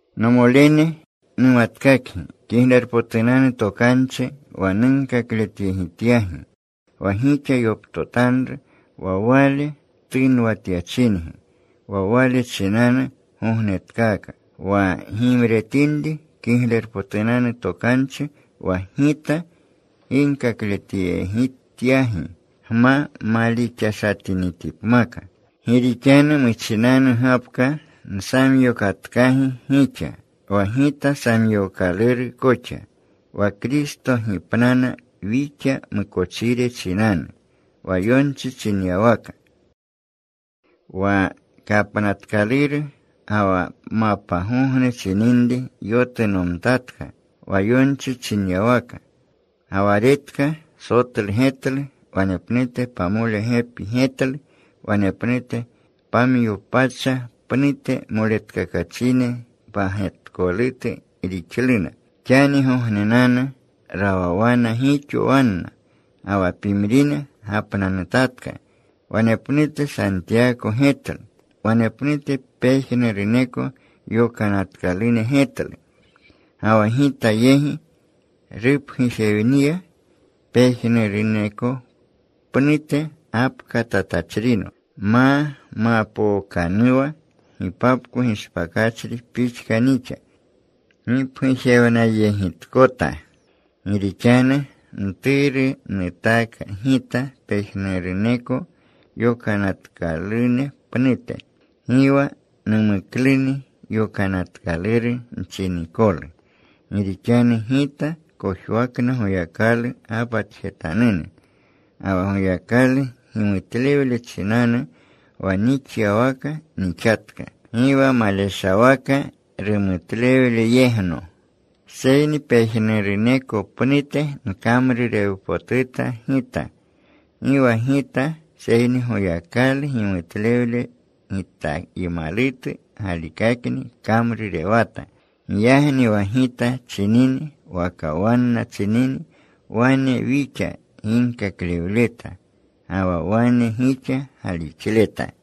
Nomolene, numatkakgi Kiglerpotunanu Tokanchi wa nunkakletyegityagi, wa gixa yoptotanru, wa wale tunwatyachingi. Wa wale chinanu gognetkaaka, wa gimretinri Kiglerpotunanu Tokanchi wa gita ginkakletyegityagi, gma malixashatinitipmaka. Gi rixanu muchinanu gapka nsamyokatkagi gixa wa gita samyookaluu koxa: Wa Kristo gipnana wixa mukochire chinanu, wa yonchi chinyawaka; wa kapnatkaluru, ga wa mapgogne chininri yotunomtatka, wa yonchi chinyawaka. Ga wa retka. Sotlu getlu. Wanepnute pamole gepi getlu. Wanepnute pamyo pacha pnute moletkakachine pagetkolutu rixluna. Xanigognenanu rawawana gixo wanna, ga wa pimrine gapnanutatka. Wanepnute Santiyako getlu. Wanepnute pejnuruneko yokanatkalune getlu. Ga wa gita yegi rupgujewniya. Pejnuruneko pnute gapkatatachrino, ma mapookanuwa gipapko gishpakachri pixka nixa gipgujewnayegitkota. Gi rixanu mturu nutaaka gita pejnuruneko yokanatkalune pnute. Gi wa numukluni yokanatkaluru nchinikolu, gi rixanu gita kojwakna Goyakalu gapatjetanune. Ga wa Goyakalu gimutlewle chinanu, wa nixyawaka nixatka. Gi wa maleshawaka; rumutlewleyegitno. Seyni pejnuruneko pnute nkamrurewpotuta gita. Gi wa gita, seyni Goyakalu gimutlewle gitaymalutu galikakni kamrurewata. Giyagni wa gita chinini waka wanna chinini wane wixa ginkaklewleta. Ga wa wane gixa galixleta.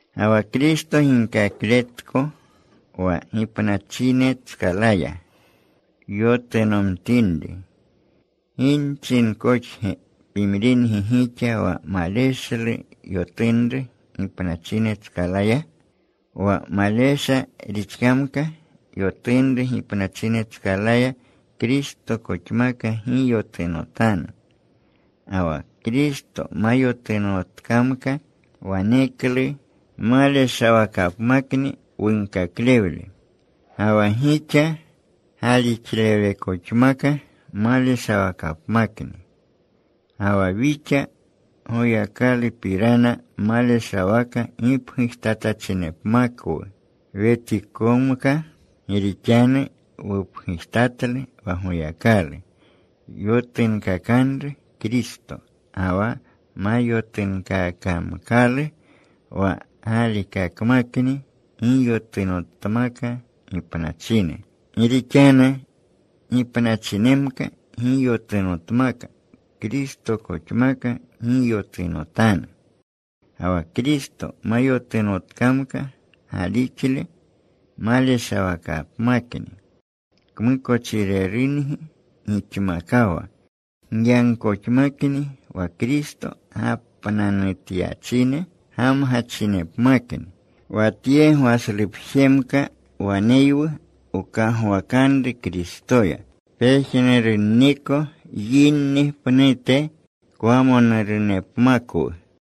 Ga wa Kristo ginkakletko wa gipnachinetskalaya yotunomtinri, ¿gi nchinkoxge pimringi gixa wa maleshlu yotunru gipnachinetskalaya? Wa malesha rixkamka yotunru gipnachinetskalaya, Kristokoxamka gi yotunotanu. Ga wa Kristo ma yotunotkamka, waneklu maleshawakapmakni wunkaklewle. Ga wa gixa galixlewlekoxmaka maleshawakapmakni. Ga wa wixa Goyakalupirana maleshawaka gipgujtatachinepmakwu wetikomka, gi rixanu wupgujtatlu wa Goyakalu yotunkakanru Kristo. Ga wa ma yotunkaakamkalu wa galikakmakni gi yotunotmakna gipnachine. Gi rixanu gipnachinmaka gi yotunotmaka, Kristokoxmaka gi yotunotanu. Ga wa Kristo ma yotunotkamka, galixle maleshawakapmakni. Kmukochirerungi gixmakawa. Giyagkoxmakni wa Kristo gapnanutyachine gamgachinmakni. Wa tye gwashlepjemka waneywu wkagwakanru Kristoya, pejnurunniko yinni pnute kwamonurunepmakwu.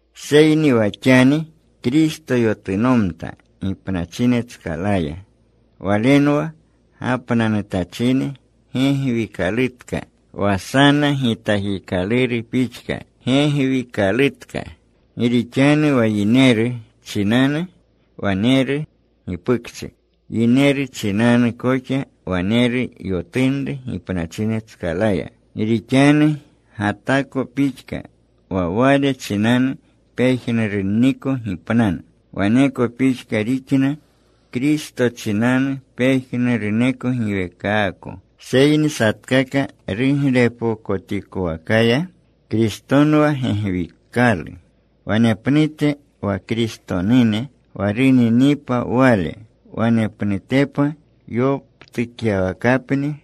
Seyni wa xani Kristo yotunomta gipnachinetskalaya. Walenwa gapnanutachine gegwikalutka, wa sana gitakikaluru pixka gegwikalutka. Gi rixanu wa yineru chinanu waneru gipukchi, yineru chinanu koxa waneru yotunru gipnachinetskalaya. Gi rixanu Gatako pixka wa wale chinanu pejnurunniko gipnana, waneko pixka rixna, Kristo chinanu pejnuruneko giweekaako. Seyni satkaka ruglepokotikowakaya. Kristonwa gegwikalu. Wanepnute wa Kristonune wa runinipa Wale. Wanepnutepa yoptukyawakapni.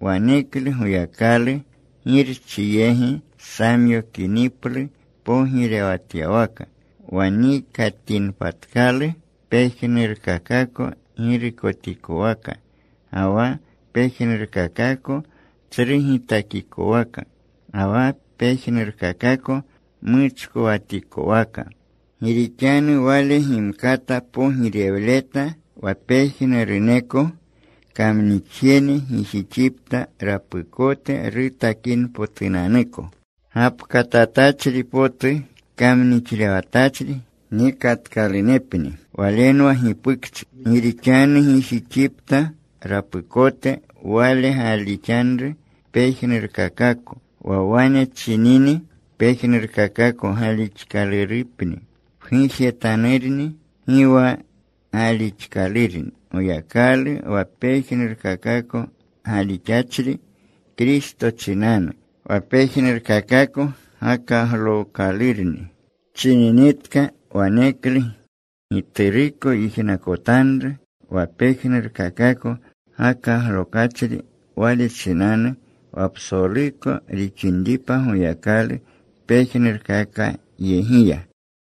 Waneklu Goyakalu, Girchi yegi samyokiniplu pogirewatyawaka, wa nikatinpatkalu pejnurkakako girukotikowaka ga wa pejnurkakako tsru gitakikowaka, ga wa pejnurkakako muchkowatikowaka. Gi rixanu Wale gimkata pogirewleta wa pejnuruneko kamnixjene gijixipta rapukote rutakinpotunanuko. Gapkatatachri potu kamnixlewatachri nikatkalunepni walenwa gipukchi. Gi rixanu gijixipta rapukote Wale gaalixanru pejnurkakako. Wa wane chinini, “pejnurkakako gaalixkalurupni,” pgujetanurni gi wa gaalixkalurni Goyakalu wa pejnurkakako gaalixachri Kristo chinanu. Wa pejnurkakako gakaglookalurni chininitka, waneklu Gituruko yijnakotanru wa pejnurkakako gakaglokachri Wale chinanu, wa psoluko rixinripa Goyakalu pejnurkakakoyegiya.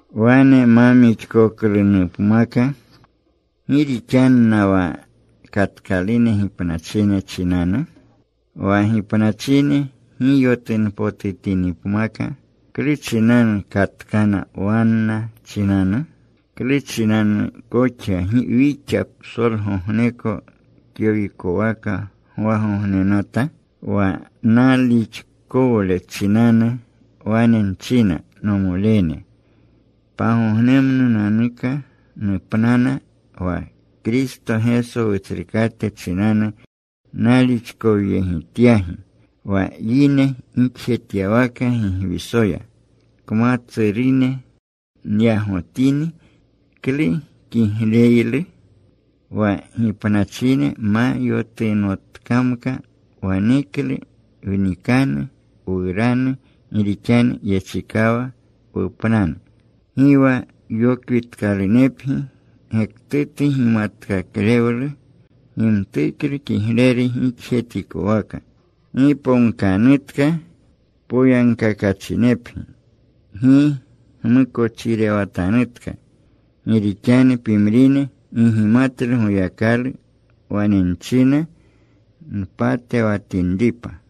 Wane ma mixkoklunupmaka ¿gi rixanna wa katkalune gipnachine chinanu? Wa gipnachine gi yotunpotutinipmaka, ¿klu chinanu katkana wanna chinanu? ¿Klu chinanu koxa wixa psolgogneko kyowikwaka gwagognenata? Wa nalixkowle chinanu wane nchina, nomolene, pagognemnunanuka nupnana. Wa Kristo Geso Wutsrukate chinanu nalixkowyegityagi. Wa yine gixjetyawaka Gigwisoya kmatsurune nyagotini, ¿klu kigleylu? Wa gipnachine ma yotunotkamka, waneklu wnikanu, wuranu. Gi rixanu yechikawa wupnanu. Gi wa yokwitkalunepgi. Gektutu gimatkaklewlu gimtuklu kigleru gixjetikowaka. Giponkanutka. Poyagkakachinepgi. Gi gmukochirewatanutka. Gi rixanu pimrine gi gimatlu Goyakalu. Wane nchina mpatewatinripa.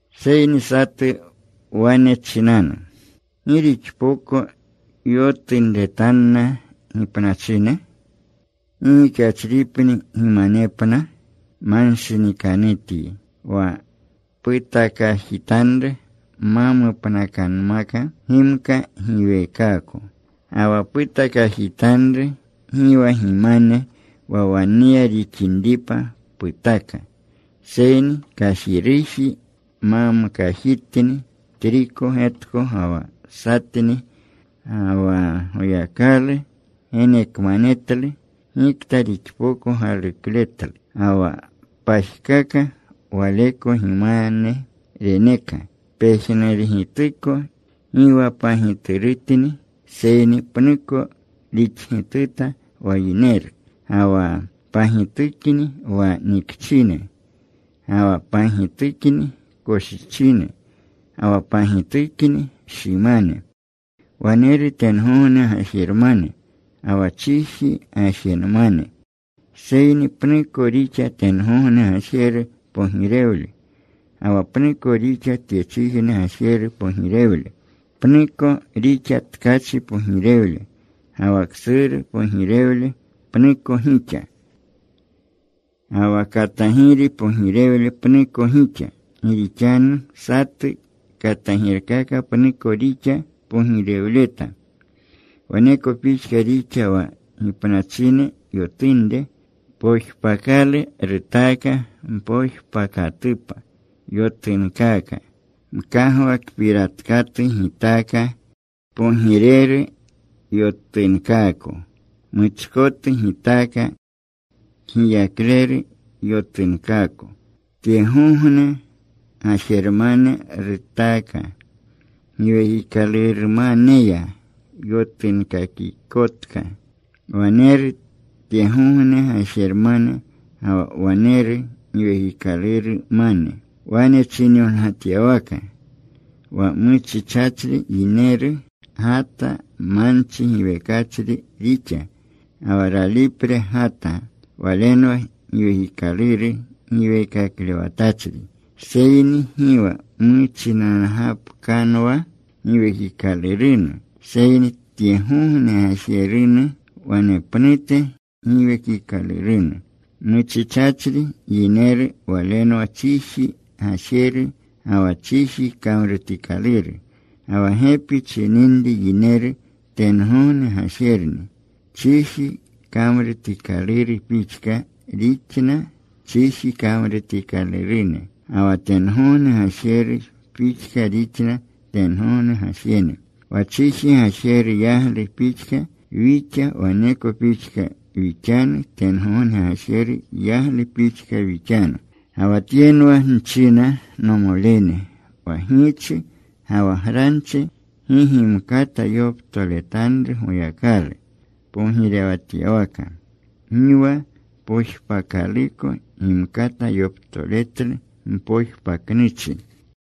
Seyni satu wane chinanu, “¿Gi rixpoko yotunretanna gipnachine? ¿Gi gixachripni gimanepna?” Manshinikanutyi. Wa putakajitanru ma mupnakanmaka gimka giwekaako. Ga wa putakajitanru gi wa gimane wa waneya rixinripa putaka, seyni kajiruji mamkajitni, triko getko ga wa satni. Ga wa Goyakalu genekmanetlu gikta rixpoko galukletlu. Ga wa pajkaka waleko gimane reneka. Pejnurugituko gi wa pagiturutni, seyni pnuko rixgituta wa yineru. Ga wa pagitukni wa nikchine. Ga wa pagitukni koshichine. Ga wa pagitukni shimane. Waneru tengogne gajermane, ga wa chiji gajermane. Seyni pnuko rixa tengogne gajeru pogirewle, ga wa pnuko rixa tyechijne gajeru pogirewle. Pnuko rixa tkachi pogirewle, ga wa ksuru pogirewle pnuko gixa. Ga wa katagiri pogirewle pnuko gixa. Gi rixanu satu katagirkaka pnuko rixa pogirewleta. Waneko pixka rixa wa gipnachine yotunre. Pojpakalu rutaaka. Mpojpakatupa yotunkaaka. Mkagwakpiratkatu gitaaka. Kpogireru yotunkaako. Muchkotu gitaaka. Kgiyakleru yotunkaako. Tyegogne gajermane rutaaka. Giwekikalurmaneya yotunkakikotka. Waneru tyegogne gajermane, ga wa waneru giwekikalurmane. Wane chinyongatyawaka: Wa muchichachri yineru Gata manchi giwekachri rixa. Ga wa ralipre Gata, Walenwa giwekikaluru giweekaklewatachri. Seyni gi wa muchinangapkanwa Giwekikalurunu, seyni tyegogne gajerunu. Wanepnute Giwekikalurunu. Muchichachri yineru walenwa chiji gajeru, ga wa chiji kamrutikaluru. Ga wa gepi chininri yineru tengogne gajerni. Chiji kamrutikaluru pixka rixna chiji kamrutikalurune. Ga wa tengogne gajeru pixka rixna tengogne gajene. Wa chiji gajeru yaglu pixka wixa, waneko pixka wixanu, tengogne gajeru yaglu pixka wixanu. Ga wa tyenwa nchina, nomolene, wa giichi ga wa granchi gi gimkata yoptoletanru Goyakalu pogirewatyawaka. Gi wa pojpakaluko gimkata yoptoletlu mpojpaknuchi.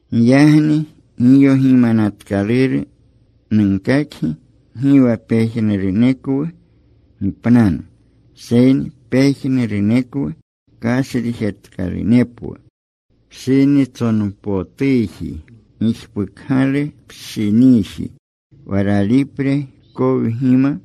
Giyagni giyogimanatkaluru nunkakgi. Gi wa pejnurunekwu gipnanu, seyni pejnurunekwu kashrijetkalunepwu. Pshinitsonpotuji, gijpukgalu pshiniji, wa ralipre kowgima.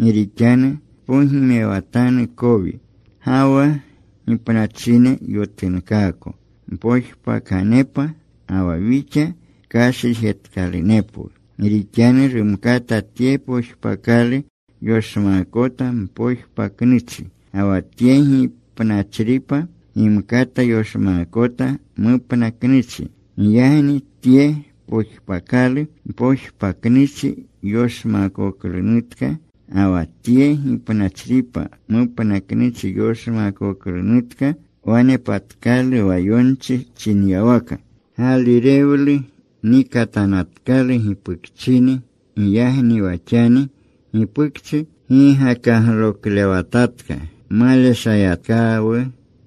Gi rixanu tpogimewatanu kowi. Ga wa gipnachine yotunkaako mpojpakanepa. Ga wa wixa kashrijetkalunepwu. Gi rixanu rumkata tye pojpakalu yoshmaakota mpojpaknuchi. Ga wa tye gipnachripa gimkata yoshmaakota mupnaknuchi. Giyagni tye pojpakalu mpojpaknuchi yoshmaakoklunutka, ga wa tye gipnachripa mupnaknuchi yoshmaakoklunutka, wanepatkalu wa yonchi chinyawaka: Gaalirewlu nikatanatkalu gipukchini. Giyagni wa xani gipukchi gi gakagloklewatatka. Maleshayatkawu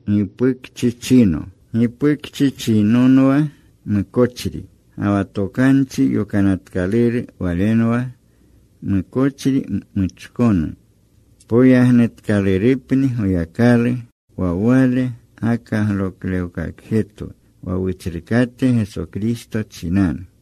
gipukchichino. Gipukchichinonwa mukochri. Ga wa Tokanchi Yokanatkaluru walenwa mukochri muchkonu. Poyagnutkalurupni Goyakalu. Wa Wale gakagloklewkakjetwu wa Wutsrukate Geso Kristo chinanu.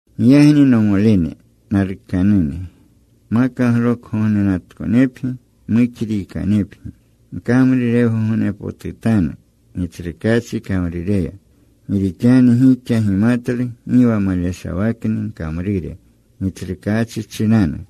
Giyagni, nomolene, nalukanune, makaglokgognenatkonepgi. Muxriikanepgi. Gkamrurewgognepotutanu Gitsrukaachi kamrureya, gi rixanu gixa gimatlu gi wa maleshawakni gkamrure Gitsrukaachi chinanu.